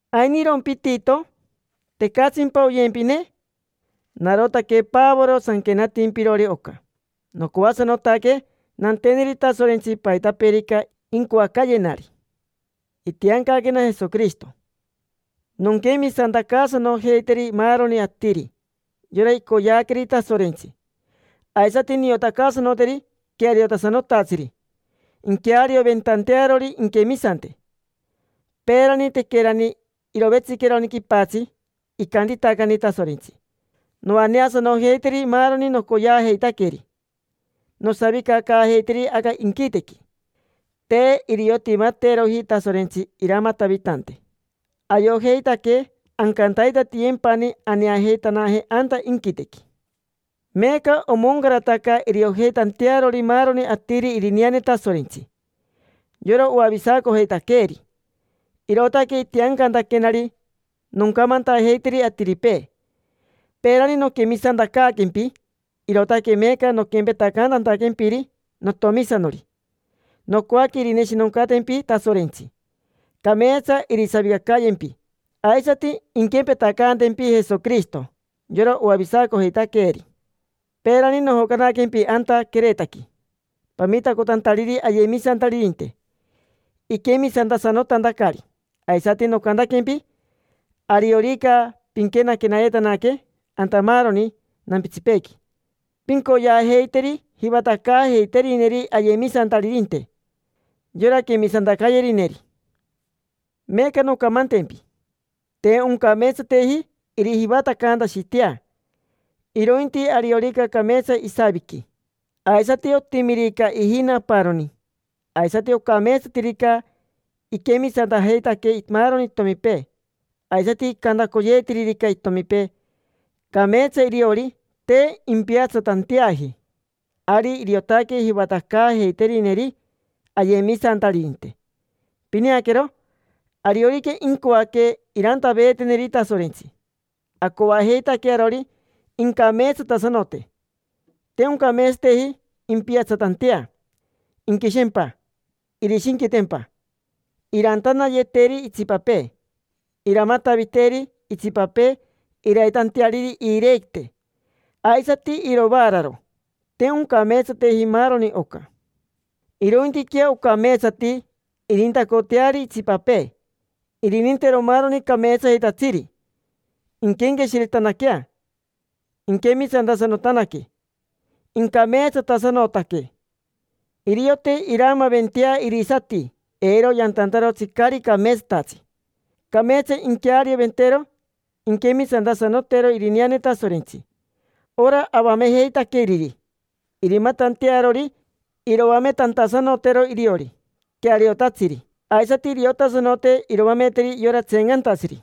¿Ainirompi Tito? ¿Tecatsimpa oyempine? Narotaque Pavoro sanquenatimpirori oca. Nocoasanotaque nanteneri Tasorentsi paitapeerica incoacayenari. Itiancaquena Jesoquirishito nonquemisantacaasanojeiteri maaroni atiri, yora icoyeaqueri Tasorentsi. Aisati niotacaasanoteri queariotasanotatsiri inquearioventantearori inquemisante. Peerani, tequerani irovetsiqueroni quipatsi, icantitacani Tasorentsi: “Noaneasanojeiteri maaroni nocoyeajeitaqueri, nosavicacaajeiteri aca inquitequi”. Te iriotimateroji Tasorentsi iramatavitante. Ayojeitaque ancantaitatiyempani aneajeitanaje anta inquitequi. Meeca omoncarataca iriojeitantearori maaroni atiri irineane Tasorentsi, yora oavisacojeitaqueeri. Irootaque itiancantaquenari noncamantajeiteri atiripee. Peerani noquemisantacaaquempi, irootaque meeca noquempetacantantaquempiri notomisanori. Nocoaque irineshinoncatempi Tasorentsi, cameetsa irisavicacayempi, aisati inquempetacayempi Jesoquirishito, yora oavisacojeitaqueeri. Peerani nojocanaquempi anta Queretaqui, pamitacotantariri ayemisantaririnte iquemisantasanotantacari. Aisati nocantaquempi: “Ariorica pinquenayetanaque anta maaroni nampitsipeequi, pincoyeajeiteri jivatacaajeiterineri ayemisantaririnte, yora quemisantacayerineri”. Meeca noncamantempi. Te oncameetsateji irijivatacantashitea; irointi ariorica cameetsa isaviqui, aisati otimirica ijina aparoni, aisati ocameetsatirica iquemisantajeitaque maaroni itomipee, aisati icantacoyeetiririca itomipee: “Cameetsa iriori, te impiatsatanteaji”, ari iriotaque jivatacaajeiterineri ayemisantaririnte. Pineaquero, ariorica incoaque irantaveeteneri Tasorentsi, acoajeitaque arori incameetsatasanote. Te oncameetsateji impiatsatantea, inquishempa, irishinquitempa, irantanayeteri itsipapee, iramataviteri itsipapee iraitanteariri iirequite aisati iroaararo. Te oncameetsateji maaroni oca. Irointiquea ocameetsati irintacoteari itsipapee, irinintero maaroni cameetsayetatsiri, inquenqueshiretanaquea, inquemisantasanotanaque, incameetsatasanotaque, iriote iraamaaventea irisati eiro yantantarotsi caari cameetsatatsi. Cameetsa inquearioventero inquemisantasanotero irineane Tasorentsi, ora avamejeitaqueriri, irimatantearori iroametantasanotero iriori queariotatsiri. Aisati iriotasanote iroameteri yora tseencantatsiri.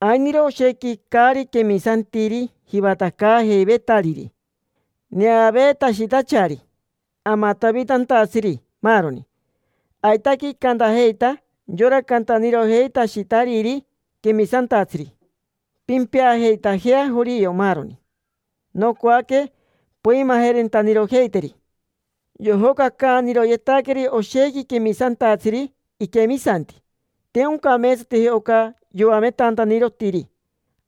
Ainiro oshequi caari quemisantiri jivatacaajeivetariri, neaveetashitachari, amatavitantatsiri, maaroni. Aitaque icantajeita yora cantanirojeitashitariri quemisantatsiri: “Pimpeajeitajea jorio, maaroni”. Nocoaque poimajerentanirojeiteri. Yojocacaaniroyetaqueri oshequi quemisantatsiri iquemisanti. Te oncameetsateji oca yoametantanirotiri.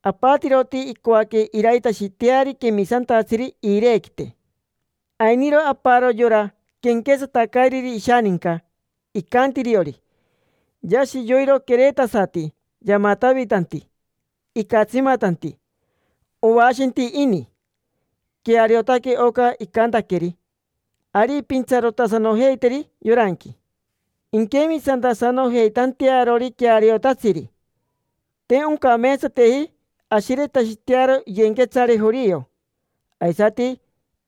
Apatiroti icoaque iraitashiteari quemisantatsiri iirequite. Ainiro aparo, yora quenquetsatacairiri ishaninca, icanti iriori: “Yashi yoiro queretasati yamatavitanti, icatsimatanti. Oashenti ini”. Queariotaque oca icantaqueri. Ari pintsarotasanojeiteri yoranqui, inquemisantasanojeitantearori queariotatsiri. Te oncameetsateji ashiretashitearo iyenquetsare jorio, aisati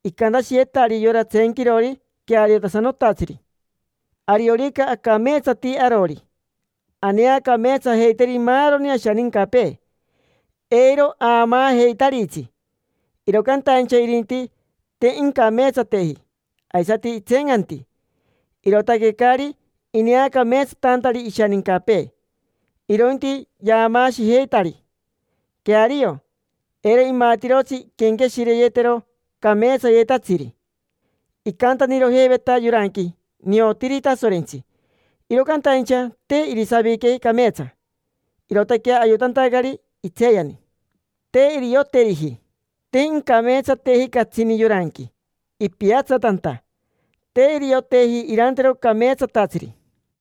icantashiyetari yora tseenquirori queariotasanotatsiri. Ariorica acameetsati arori, aneacameetsajeiteri maaroni ashanincapee, eiro aamaajeitaritsi. Iro cantaincha irinti, te incameetsateji, aisati itseencanti, irootaque caari ineacameetsatantari ishanincapee; irointi yaamaashijeitari. Queario, eiro imatirotsi inquenqueshireyetero cameetsayetatsiri. Icantanirojeiveta yoranqui: “Niotiri Tasorentsi”, iro cantaincha te irisavique cameetsa, irootaque ayotantacari itseeyani, te irioteriji. Te incameetsateji catsini yoranqui, ipiatsatanta, te irioteji irantero cameetsatatsiri.